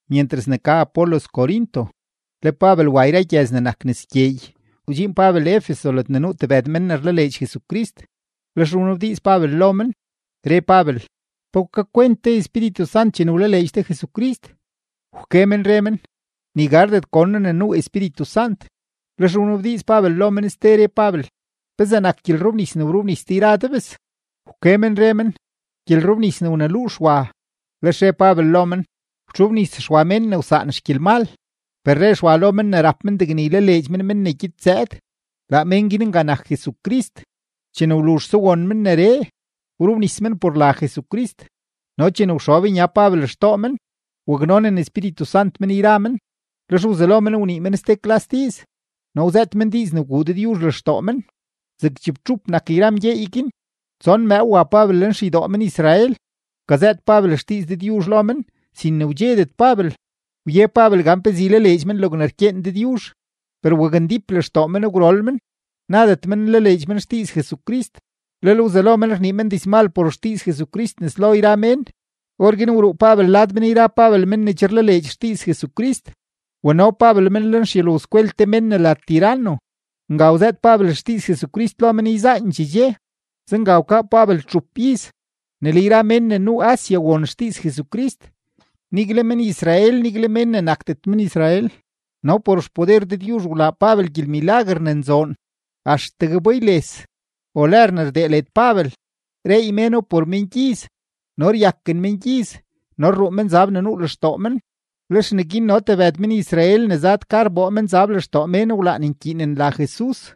Myentras ne ka Apolos Corinto, le Pabel wa yra gyëz ne nak nes gyeey, wdxiin Pabel Efeso ledne nuu tebëd men ne rlaleedx Jesucrist. Lex wnabdiiz Pabel lo men, re Pabel: ―¿Pe wkakwent de Espíritu Sant chene wlaleedx de Jesucrist? Wke men re men: ―Ni gardet gon noo ne nuu Espíritu Sant. Lex wnabdiiz Pabel lo men ste, re Pabel: ―¿Pezee nak gyelrobnis ne wrobnis de yra de bes? Wke men re men: ―Gyelrobnis ne wneluu Xwa. Lex re Pabel lo men: ―Wtxobnis Xwa mén ne wsaan xgyelmal, per re Xwa lo men ne rap men degne ylaleedx men men ne gyed zëëd; laa mén guin nga nak Jesucrist. Chene wluzhse won men neree, wrobnis men por la Jesucrist. No chene wxob nya Pabel xtoo men, waknonen Espíritu Sant men yra men, lex wzelo men wnii men ste klas diiz no wzëët men diiz ne wguu Dëdyuzh lextoo men. Zeg chibtxup nak yra mgyeey guin. Tson mëëw wa Pabel lenxeydoo men-Israel, wkazëët Pabel xdiiz Dëdyuzh lo men sin ne wdxedet Pabel; wye Pabel gan pezee ylaleedx men logne rkyeen Dëdyuzh. Per wakndíp lextoo men gwrol men, nadet men nlaleedx men xdiiz Jesucrist, lel wzelo men rnii men dizmal por xdiiz Jesucrist nes lo yra mén. Orguin wruu Pabel lad men yra Pabel men ne che rlaleedx xdiiz Jesucrist, wano Pabel men lenxyulowskwel te mén ne la Tiranno. Nga wzëët Pabel xdiiz Jesucrist lo men yzaandxee dxe. Zenga wkaa Pabel txup iz, ne le yra mén ne nuu Asia won xdiiz Jesucrist, nigle men-Israel, nigle mén ne nakdet men-Israel. No por xpoder Dëdyuzh wlaa Pabel gyelmilaguer ne nzoon. Axtegue bayles o lër ne rdee led Pabel, reey méno por mengyiz no ryaken mengyiz no rruu menzab ne nuu lextoo men. Lex neguin no tebëd men-Israel ne zad ka rboo menzab lextoo mén wlaan nkyiinen la Jesus,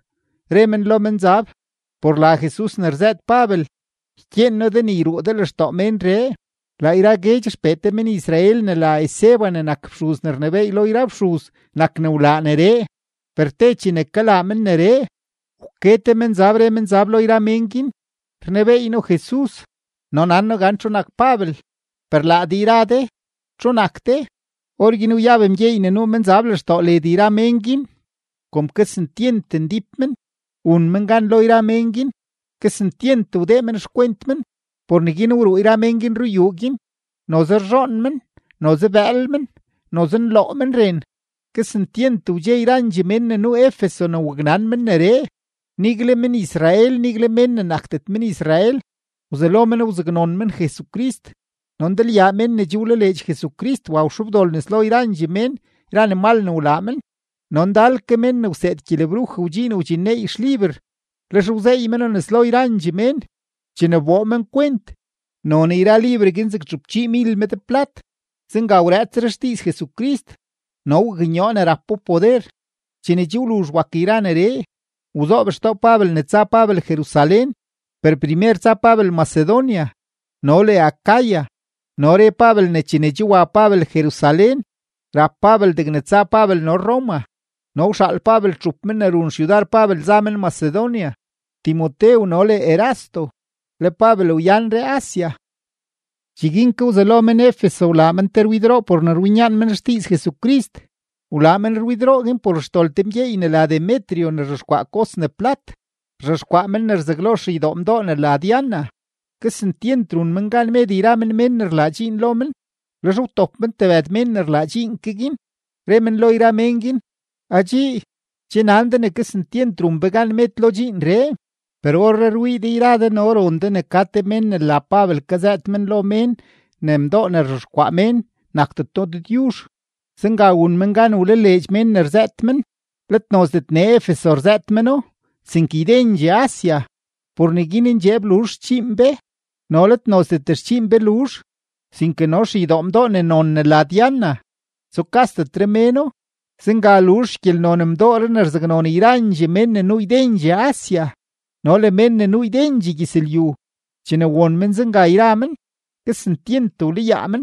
re men lo menzab: ―Por la Jesus ne rzëët Pabel, ykyeen noo de ne yruu de lextoo ménree. Laa yra guedx xpee te men-Israel ne la Esceva ne nak te fxuz ne rnebééy lo yra fxuz nak ne wlaa neree. Per te chene kalaa men neree, wke te menzab, re menzab lo yra mén guin: ―Rnebeey noo Jesus, no nan noo gan txu nak Pabel, per laa de yra de, ¿txu nak de? Orguin wyab mgyeey ne nuu menzab lextoo led yra mén guin; kom kesentyent ndíp men, wun men gan lo yra mén guin; kesentyent wdee men xkwent men; por neguin wruu yra mén guin ruyuu guin, noze rzhoon men, noze bëël men, noze nloo men ren. Kesentyent wdxe yrandxee mén ne nuu Efeso ne waknan men neree, nigle men-Israel, nigle mén ne nakdet men-Israel; wzelo men wzaknon men Jesucrist. No ndalyaa mén ne che wlaleedx Jesucrist wa wxobdol nes lo yrandxee mén yra ne mal ne wlaa men. No ndal ke mén ne wseed gyelebruj wdxiin wdxinneey xliber, lex wzeey meno nes lo yrandxee mén. Chene wboo men kwent, non yra liber guin zeg txupchiimil med plat. Zenga wrëëtsre xdiiz Jesucrist no waknyoo ne rapo poder. Chene che wluzh wak yra neree, wzoob xtoo Pabel ne tsa Pabel Jerusalén, per primer tsa Pabel Macedonia no le Acaya. No re Pabel ne chene che wa Pabel Jerusalén, rap Pabel degne tsa Pabel no Roma. No wxaal Pabel txup men ne run xyudar Pabel za men Macedonia, Timotew no le Erasto, le Pabel wyanre Asia. Cheguin ke wzelo men-Efeso wlaa men te rwidroo por ne rwinyaan men xdiiz Jesucrist. Wlaa men rwidroo guin por xdol te mgyeey ne la Demetrio ne rzhexkwaa kos ne plat; rzhexkwaa men ne rzaglo xeydoo mdoo ne la Diana. Kesentyent run men gan med yra men mén ne rlaa dxiin lo men. Lex wtop men tebëd mén ne rlaa dxiin ke guin, re men lo yra mén guin: ―Adxii, che nan de ne kesentyent run be gan med lo dxiinree. Per orree rwii de yra de no ron de ne ka te mén ne la Pabel kazëët men lo mén ne mdoo ne rzhexkwaa mén nakdeto dëdyuzh; zenga wun men gan wlaleedx mén ne rzëët men, let nozdet nee Efeso rzëët meno sinke ydendxee Asia. Por neguin ndxeeb luzh xdxiin be, no let nozdet xdxiin be luzh, sinke no xeydoo mdoo ne non ne la Diana, tsukasdetre méno. Zenga luzh yra xgyelnon mdooree ne rzaknon yrandxee mén ne nuu ydendxee Asia no le mén ne nuu ydendxee gyëzlyu. Chene won men zenga yra men, kesentyent wlayaa men,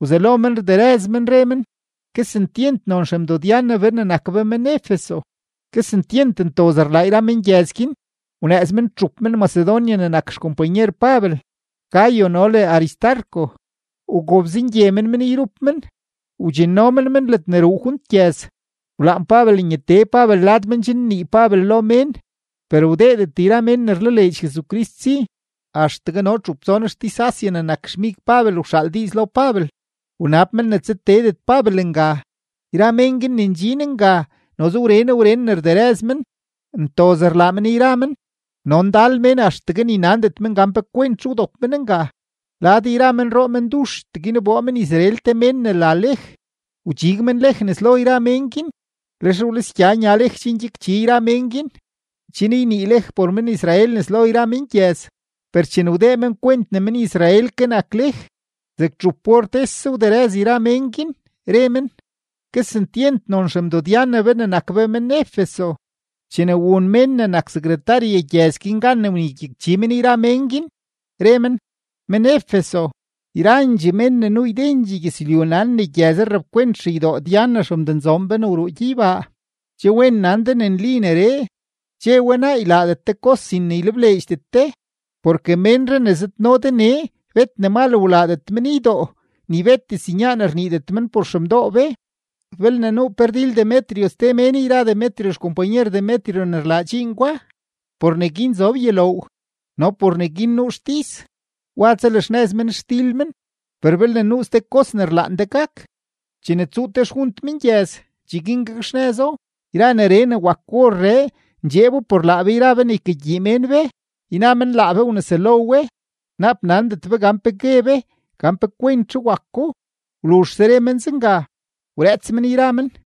wzelo men rderëz men, re men: ―¡Kesentyent non xemdo-Diana be ne nak be men-Efeso! Kesentyent ntoz rlaa yra mengyëz guin. Wnëëz men txup men-Macedonia ne nak xkompanyer Pabel, Gayo no le Aristarco, wgobzengye men men yrup men, wdxinno men men ledne ruu junt gyëz. Wlaan Pabel nyatee Pabel lad men chen nnii Pabel lo mén, per wdeedet yra mén ne rlaleedx Jesucrist si. Axtegue no txup tson xtis-Asia ne nak xmig Pabel wxaal diiz lo Pabel, wnab men ne tsateedet Pabel nga. Yra mén guin ne ndxin nga noze wren wren ne rderëz men, ntoz rlaa men yra men, no ndal mén axtegue ni nandet men gan pe kwentzhe wdop men nga. Lad yra menroo menduxtee guin wboo men-Israel te mén ne la Lej, wdxig men Lej nes lo yra mén guin. Lex wlisgya nya Lej chen gyakchi yra men guin, chen ynii Lej por men-Israel nes lo yra mengyëz. Per chene wdee men kwent ne men-Israel ke nak Lej, zeg txup or tese wderëz yra mén guin, re men: ―¡Kesentyent non xemdo-Diana be ne nak be men-Efeso! Chene wun mén ne nak sekretarye gyëz guin gan ne wnegyakchi men yra mén guin, re men: ―Men-Efeso, yrandxee mén ne nuu ydendxee gyëzlyu nan ne gyëzree rapkwent xeydoo Diana xemdonzoon be ne wruu gyeybaa. Che wen nan de ne nli neree; che we naa, ylaadet de kos sin ylebleedxdet de. Porke ménree ne zëdno de nee bet ne mal wlaadet men ydoo ni bet diznyaan rniidet men por xemdoo be. Belne nuu pe rdil Demetrio ste mén yra Demetrio xkompanyer Demetrio ne rlaa dxiin gwa, por neguin zob yuloow no por neguin nuu xtis, wa tsalaxnëz men xdil men. Per belne nuu ste kos ne rlaan de gak, chene tsuu te xjunt mengyëz, cheguin gakxnëzo. Yra neree ne wak orree ndxeebo por laa be yra be ne ykagyii mén be, yna men laa be wneselo we; naap nandet be gan pe gue be gan pe kwentzhe wako. Wluzhse re men zenga, wrëëts men yra men.